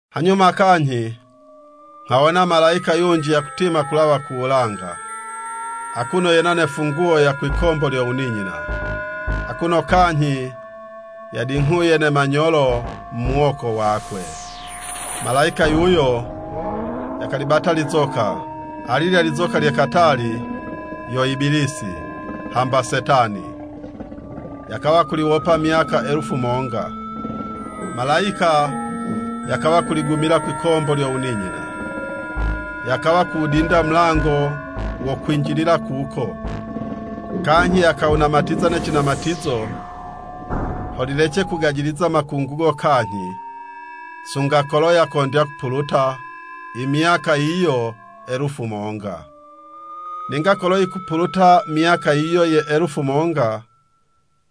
Hanyuma kanyhi nghawona malayika yunji yakutima kulawa ku wulanga, akuno yena ne funguwo ya kwikombo lyo wuninyina, akuno kanyhi yadinghuye ne manyolo mu muwoko wakwe. Malayika yuyo yakalibata lizoka, alilya lizoka lye katali, yo Ibilisi, hamba Setani, yakawa kuliwopa myaka elufu monga. Malayika yakawa kuligumila kwikombo lyo wuninyina, yakawa kuwudinda mulango wo kwinjilila kuko, kanyhi yakawunamatiza ne cinamatizo, ho lilece kugajiliza makungugo kanyhi, sunga kolo yakondya kupuluta i myaka yiyo elufu monga. Ninga kolo yikupuluta myaka yiyo ye elufu monga,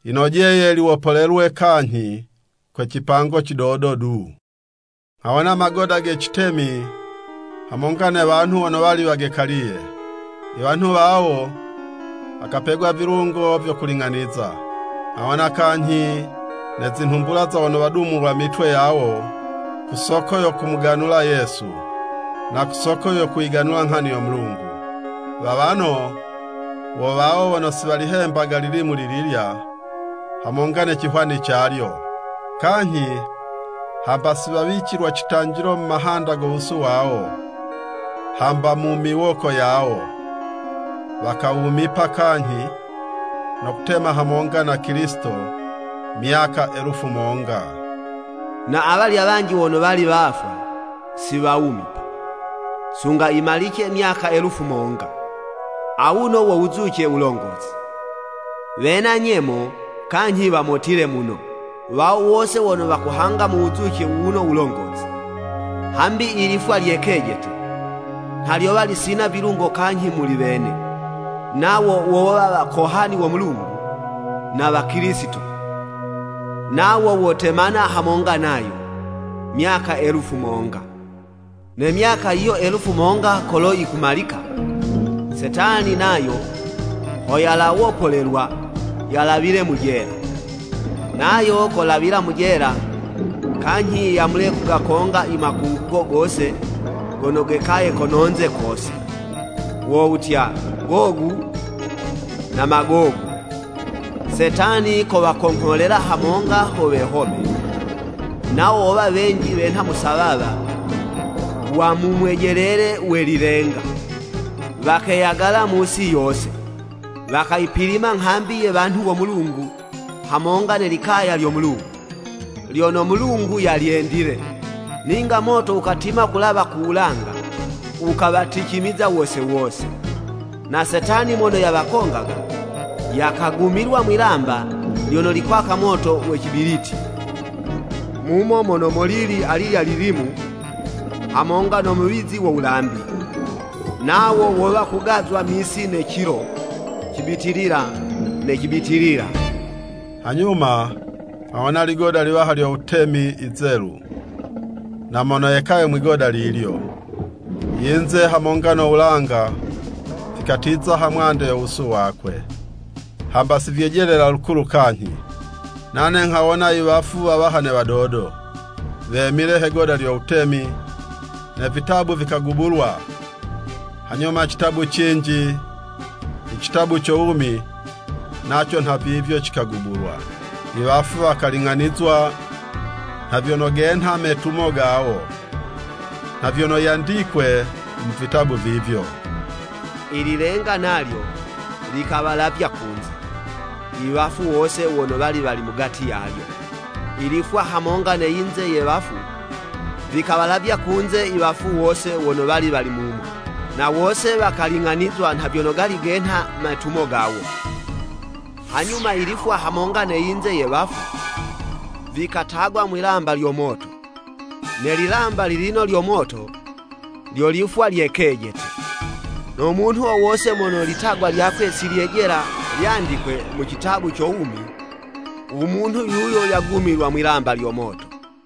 yinojeye liwopolelwe kanyhi kwe cipango cidodo du. Nghawona magoda ge citemi hamonga ne wanhu wono wali wagekaliye. I wanhu wawo, wakapegwa vilungo vyo kuling'aniza. Nghawona kanyhi ne zinhumbula za wono wadumulwa mitwe yawo ku soko yo kumuganula Yesu, na ku soko yo kuyiganula nghani yo Mulungu. Wawano wo wawo wono si walihemba lilimu lililya hamonga ne cihwani calyo, kanyhi hamba si wawicilwa citanjilo mu mahanda go wusu wawo, hamba mu miwoko yawo. Wakawumipa kanyhi, no kutema hamonga na Kilisito myaka elufu monga. (Na awalya wanji wono wali wafwa, si wawumipa, sunga yimalice myaka elufu monga.) Awuno wo wuzuce wulongozi. Wena nyemo, kanyhi wamotile muno, wawo wose wono wakuhanga mu wuzuce wuwuno wulongozi. Hambi i lifwa lye kejete, nha lyowa lisina vilungo kanyhi muli wene, nawo wowa wakohani wo Mulungu na wa Kilisito, nawo wotemana hamonga nayo, myaka elufu monga. Ne myaka yiyo elufu monga kolo yikumalika, Setani nayo ho yalawopolelwa yalawile mu jela. Nayo kolawila mu jela, kanyhi yamule kugakonga i makungugo gose gono geyagaye kono'nze kose, wo wutya, Gogu na Magogu. Setani kowakongholela hamonga ho wehome, nawo wowa wenji wenha musawawa wa mu Mwejelele we lilenga. Wakeyagala mu'si yose, wakayipilima nghambi ye wanhu wo Mulungu hamonga ne likaya lyo Mulungu, lyono Mulungu yalyendile. Ninga moto wukatima kulawa ku wulanga wukawaticimiza wose wose. Na Setani mono yawakongaga, yakagumilwa mwi'lamba lyono likwaka moto we cibiliti, mumo mono molili alilya lilimu, hamonga no muwizi wo wulambi, nawo wowa kugazwa misi ne cilo, cibitilila ne cibitilila. Hanyuma nghawona ligoda liwaha lyo wutemi, yizelu, na mono yekaye mwi'goda lilyo. I yinze hamonga no wulanga, vikatiza ha mwande yo wusu wakwe, hamba si vyejelela lukulu kanyhi. Nane nghawona i wafu wawaha ne wadodo, wemile he'goda lyo wutemi, ne vitabu vikagubulwa. Hanyuma citabu cinji, i citabu co wumi, naco nhavivyo cikagubulwa. Iwafu wakaling'anizwa nha vyono genha metumo gawo, nha vyono yandikwe mu vitabu vivyo. I lilenga nalyo, likawalavya kunze, i wafu wose wono wali wali mugati yalyo, i lifwa hamonga ne yinze ye wafu, vikawalavya kunze iwafu wose wono wali wali mumo. Na wose wakaling'anizwa nha vyono genha metumo gawo. Hanyuma ilifwa hamonga ne yinze ye wafu, vikatagwa mwilamba lyo moto. Ne lilamba lilino lyo moto, lyo lifwa lye kejete. No munhu wo wose mono litagwa lyakwe si lyejela lyandikwe mu citabu co wumi, u munhu yuyo yagumilwa mwilamba lyo moto.